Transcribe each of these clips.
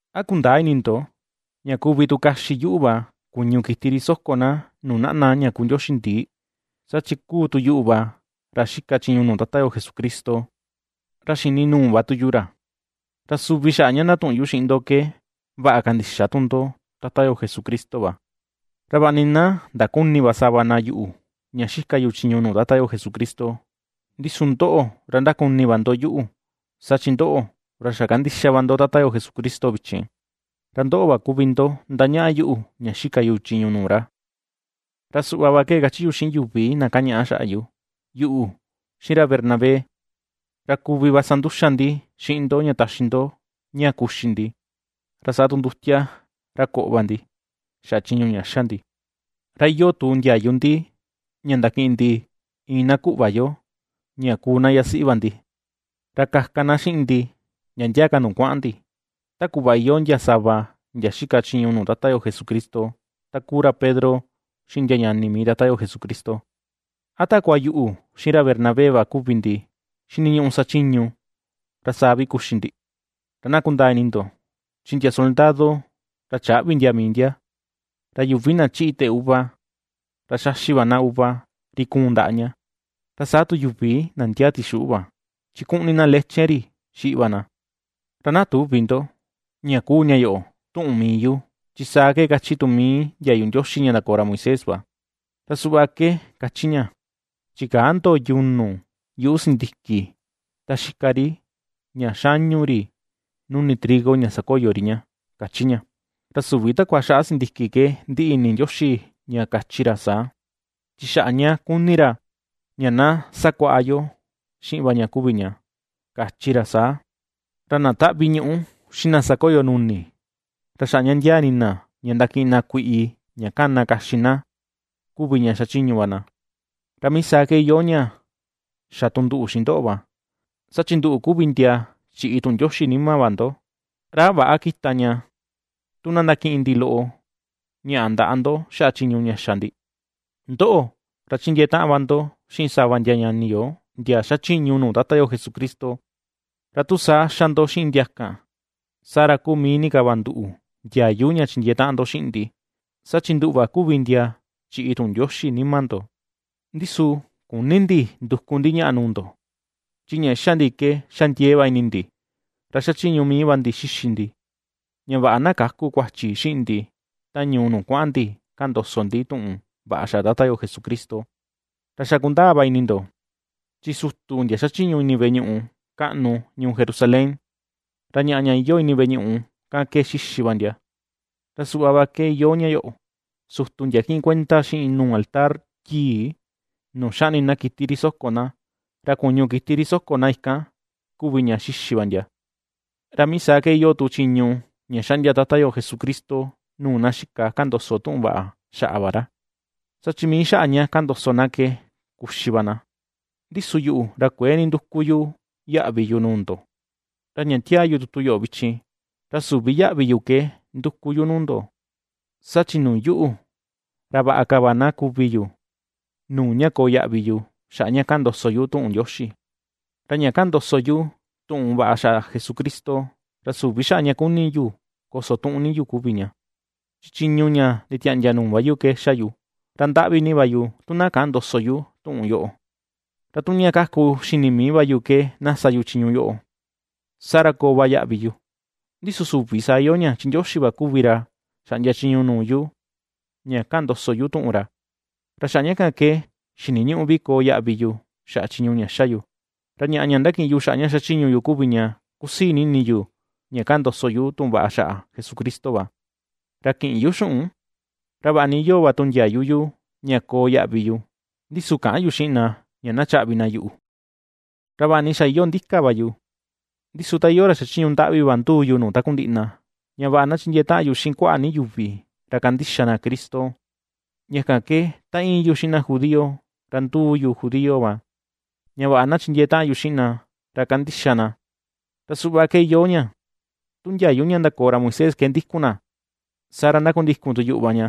¿A kundäa ini ndo ña kuvi tu kaxi yuꞌu va kuñu kiti ri soko na nuu naꞌna ña kuu ndioxi ndii? Saa chi kuu tu yuꞌu va ra xika chiñu nuu Tata yo Jesucristo, ra xini nuu va tu yu ra, ra suvi xaꞌa ña ndatuꞌun yu xiꞌin ndo ke vaꞌa kandixa tu ndo Tata yo Jesucristo va. Ra vaꞌa ni na ndaküni va sava na yuꞌu ña ^xika yu chiñu nuu Tata yo Jesucristo, ndi su ndoꞌo, ra ^ndakuni va ndo yuꞌu; saa chi ndoꞌo, ra xa ^kandixa va ndo Tata yo Jesucristo vichin, ra ndoꞌo va kuvi ndo ^ndañaꞌa yuꞌu ña xika yu chiñu nuu ra. Ra suꞌva va ke ^kachi yu xiꞌin yuvi na kañaꞌa xaꞌa yu: Yuꞌu, xiꞌin ra Bernabé, ra kuvi va sa nduxa ndi xiꞌin ndo ña taxi ndo ña kuxi ndi, ra saa tu ndutia ra koꞌo va ndi, xaꞌa chiñu ña xa ndi, ra iyoo tu ndiayu ndi, ña ndakiꞌin ndi iin na kuꞌva yo ña kuu na yasiꞌi va ndi, ra kaka na xiꞌin ndi, ndia ndia ka nuu kuaꞌan ndi, ta kuꞌva iyoo ndia sava ndia xika chiñu nuu Tata yo Jesucristo, ta kuu ra Pedro, xiꞌin ndia ñani mii Tata yo Jesucristo. ¿A takua yuꞌu, xiꞌin ra Bernabé va kuvi ndi xiniñuꞌu sachiñu, ra saa vi kuxi ndi? Ra na kundaa ini ndo, chi ndia soldado, ra chäꞌvi ndia mii ndia. Ra yuvi na chiꞌi teꞌe uva, ra xaxi va na uva ri kuun ndaꞌa ña. Ra saa tu yuvi na ndiaa tixuꞌu va, chi kuꞌní na leche ri xiꞌi va na. Ra na tüvi ndo, ña kuu ña yoꞌo tuꞌun mii yu, chi saa ke ^kachi tu mii ndiayu Ndioxi ña ndakoo ra Moisés va. Ra suꞌva ke ^kachi ña: “Chikäa ndo yunu yuꞌu sindiki ta xika ri ña xañu ri nuni trigo ña sakoyo ri ña”, ^káchí ña. Ra süvi takua xaꞌa sindiki ke ndiꞌi ini Ndioxi ña kachi ra saa, chi xaꞌa ña kuni ra ña na sakuaꞌa yo xiꞌin va ña kuvi ña, kachi ra saa. Ra na taꞌvi ñuꞌu, xiꞌin na sakoyo nuni, ra xaꞌa ña ndiaa ini na ña ndakiꞌin na kuiꞌi ña kana kaxi na kuvi ña xachiñu va na. Ra mii saa ke iyoo ña xa tu nduꞌu xiꞌin ndoꞌo va, saa chi nduꞌu kuvi ndia chiꞌi tuꞌun Ndioxi nima va ndo, ¿ra a väꞌa kita ña tu na ndakiꞌin ndi loꞌo ñaꞌa ndaꞌa ndo xaꞌa chiñu ña xa ndi? Ndoꞌo, ra chindiee taꞌan va ndo xiꞌin sava ndia ñani yo ndia xachiñu nuu Tata yo Jesucristo, ra tu saa ^xa ndo xiꞌin ndia kan, saa ra kuu mii ni ka va nduꞌu ndiayu ña chindiee taꞌan ndo xiꞌin ndi, saa chi nduꞌu va kuvi ndia chiꞌi tuꞌun Ndioxi nima ndo. Ndi su küni ndi nduku ndi ñaꞌa nuu ndo. Chi ña ^xa ndi ke xa ndiee va ini ndi, ra xachiñu mii va ndi xixi ndi, ña vaꞌa na käku kuachi xiꞌin ndi ta ñuu nuu kuaꞌan ndi kaꞌan ndoso ndi tuꞌun vaꞌa xaꞌa Tata yo Jesucristo. Ra xa kundaa va ini ndo, chi sutu ndia ^xachiñu ini veꞌe ñuꞌu kaꞌnu ñuu Jerusalén, ra ñaꞌa ña iyoo ini veꞌe ñuꞌu kan ke ^xíxi va ndia. Ra suꞌva va ke iyoo ña yoꞌo, sutu ndia kiꞌin kuenda xiꞌin nuu altar yii nuu xaꞌni na kiti ri soko na, ra kuñu kiti ri soko na ikan kuvi ña xixi va ndia. Ra mii saa ke iyoo tu chiñu ña ^xaꞌndia Tata yo Jesucristo nuu na xika kaꞌan ndoso tuꞌun vaꞌa xaꞌa va ra, saa chi mii xaꞌa ña kaꞌan ndoso na ke kuxi va na. Ndi su yuꞌu, ra kuëe ninduku yu yaꞌvi yu nuu ndo, ra ña tiaa yu tutu yoꞌo vichin, ra süvi yaꞌvi yu ke nduku yu nuu ndo. Saa chi nuu yuꞌu, ¡ra vaꞌa ka va na kuvi yu nuu ña koo yaꞌvi yu xaꞌa ña kaꞌan ndoso yu tuꞌun Ndioxi! Ra ña kaꞌan ndoso yu tuꞌun vaꞌa Jesucristo, ra süvi xaꞌa ña kuni yu kosotuꞌun ni yu kuvi ña, chi chiñu ña nditiaꞌndia nuu va yu ke xa yu. ¡Ra ndaꞌvi ni va yu tu na käꞌan ndoso yu tuꞌun yoꞌo! Ra tu ña kaku xini mii yu ke na sa yu chiñu yoꞌo, saa ra koo va yaꞌvi yu, ndi su süvi saa iyoo ña, chi Ndioxi va kuvi ra xaꞌndia chiñu nuu yu ña ^kaꞌan ndoso yu tuꞌun ra, ra xaꞌa ña kan ke xiniñüꞌu vi koo yaꞌvi yu xaꞌa chiñu ña ^xa yu. Ra ñaꞌa ña ^ndakiꞌin yu xaꞌa ña xachiñu yu kuvi ña, kusii ni ini yu ña kaꞌan ndoso yu tuꞌun vaꞌa xaꞌa Jesucristo va, ra kïꞌin yu xuꞌun; ra vaꞌa ni iyoo va tu ndiayu yu ña koo yaꞌvi yu, ndi su käꞌan yu xiꞌin na ña chaꞌvi na yuꞌu. Ra vaꞌa ni xa iyoo ndika va yu, ndi su ta iyoo ra xachiñu ndaꞌvi va nduu yu nuu takundiꞌi na, ña vaꞌa na chindiee taꞌan yu xiꞌin kuaꞌa ni yuvi, ra kandixa na Cristo. Ña kan ke ta íin yu xiꞌin na judío, ra nduu yu judío va, ña vaꞌa na chindiee taꞌan yu xiꞌin na, ra kandixa na; ra suꞌva ke iyoo ña, tu ndiayu ña ndakoo ra Moisés ke ndikun na, saa ra ndakundikun tu yuꞌu va ña,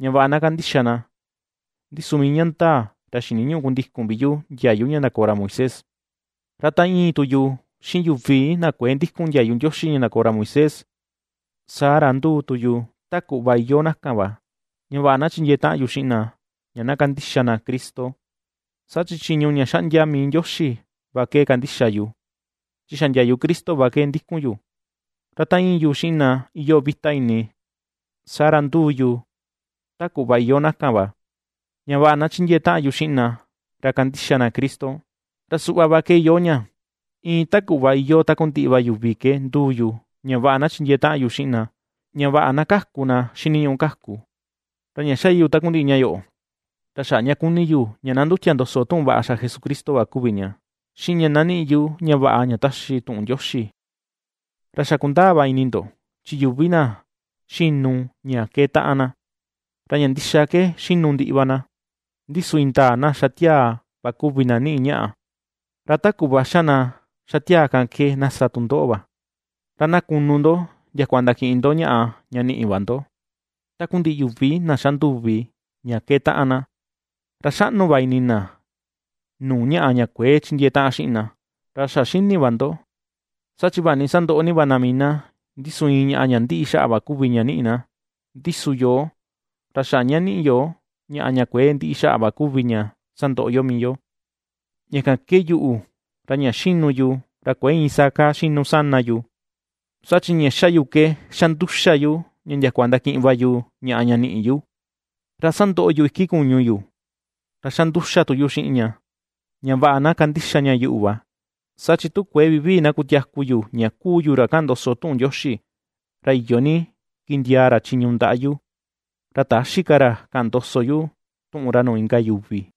ña vaꞌa na kandixa na, ndi su mii ña ndaa, ra xiniñüꞌu kundikun vi yu ndiayu ña ndakoo ra Moisés. Ra ta íin tu yu xiꞌin yuvi na kuëe ndikun ndiayu Ndioxi ña ndakoo ra Moisés, saa ra nduu tu yu ta kuꞌva iyoo na kan va, ña vaꞌa na chindiee taꞌan yu xiꞌin na ña kandixa na Cristo, saa chi chiñu ña ^xaꞌndia mii Ndioxi va ke kandixa yu, chi xa ndiayu Cristo va ndikun yu. Ra ta íin yu xiꞌin na iyoo vita ini, saa ra nduu yu ta kuꞌva iyoo na kan va, ña vaꞌa na chindiee taꞌan yu xiꞌin na, ra kandixa na Cristo. Ra suꞌva ke iyoo ña, iin ta kuꞌva iyoo takundiꞌi va yuvi ke ^nduu yu ña vaꞌa na chindiee taꞌan yu xiꞌin na, ña vaꞌa na kaku na xiniñuꞌu kaku. Ra ña xa yu takundiꞌi ña yoꞌo, ra xaꞌa ña kuni yu ña na ndutia ndoso tuꞌun vaꞌa xaꞌa Jesucristo va kuvi ña, xiꞌin ña na niꞌi yu ña vaꞌa ña taxi tuꞌun Ndioxi. Ra xa ^kundaa va ini ndo, chi yuvi na xinu ña keetaꞌan na, ra ña ndixa ke xinu ndiꞌi va na, ndi su indaa na xa tiaa va kuvi na niꞌi ñaꞌa. Ra ta kuꞌva xa na xa tiaa kan ke na sa tu ndoꞌo va, ra na kunu ndo ndiakua ndakiꞌin ndo ñaꞌa ña niꞌi va ndo. Takundiꞌi yuvi na xa nduvi ña keetaꞌan na, ra xaꞌnu va ini na nuu ñaꞌa ña kuëe chindiee taꞌan xiꞌin na. Ra xa xini va ndo, saa chi vaꞌa ni sandoꞌo ni va na mii na, ndi su iin ñaꞌa ña ndiꞌi xaꞌa va kuvi ña niꞌi na, ndi su yoo, ra xaꞌa ña niꞌi yo ñaꞌa ña kuëe ndiꞌi xaꞌa va kuvi ña sandoꞌo yo mii yo. Ña kan ke yuꞌu, ra ña xinu yu, ra kuëe iin saa kaa xinu yu sana yu; saa chi ña xa yu ke xa nduxa yu ña ndiakua ndakiꞌin va yu ñaꞌa ña niꞌi yu. Ra sandoꞌo yu iki kuñu yu, ra xa nduxa tu yu xiꞌin ña, ña vaꞌa na kandixa ña yuꞌu va, saa chi tu kuëe vivii na kutiaku yu ña kuu yu ra kaꞌan ndoso yu tuꞌun Ndioxi, ra iyo ni kindiaa ra chiñu ndaꞌa yu, ra täxi ka ra kaꞌan ndoso yu tuꞌun ra nuu inka yuvi.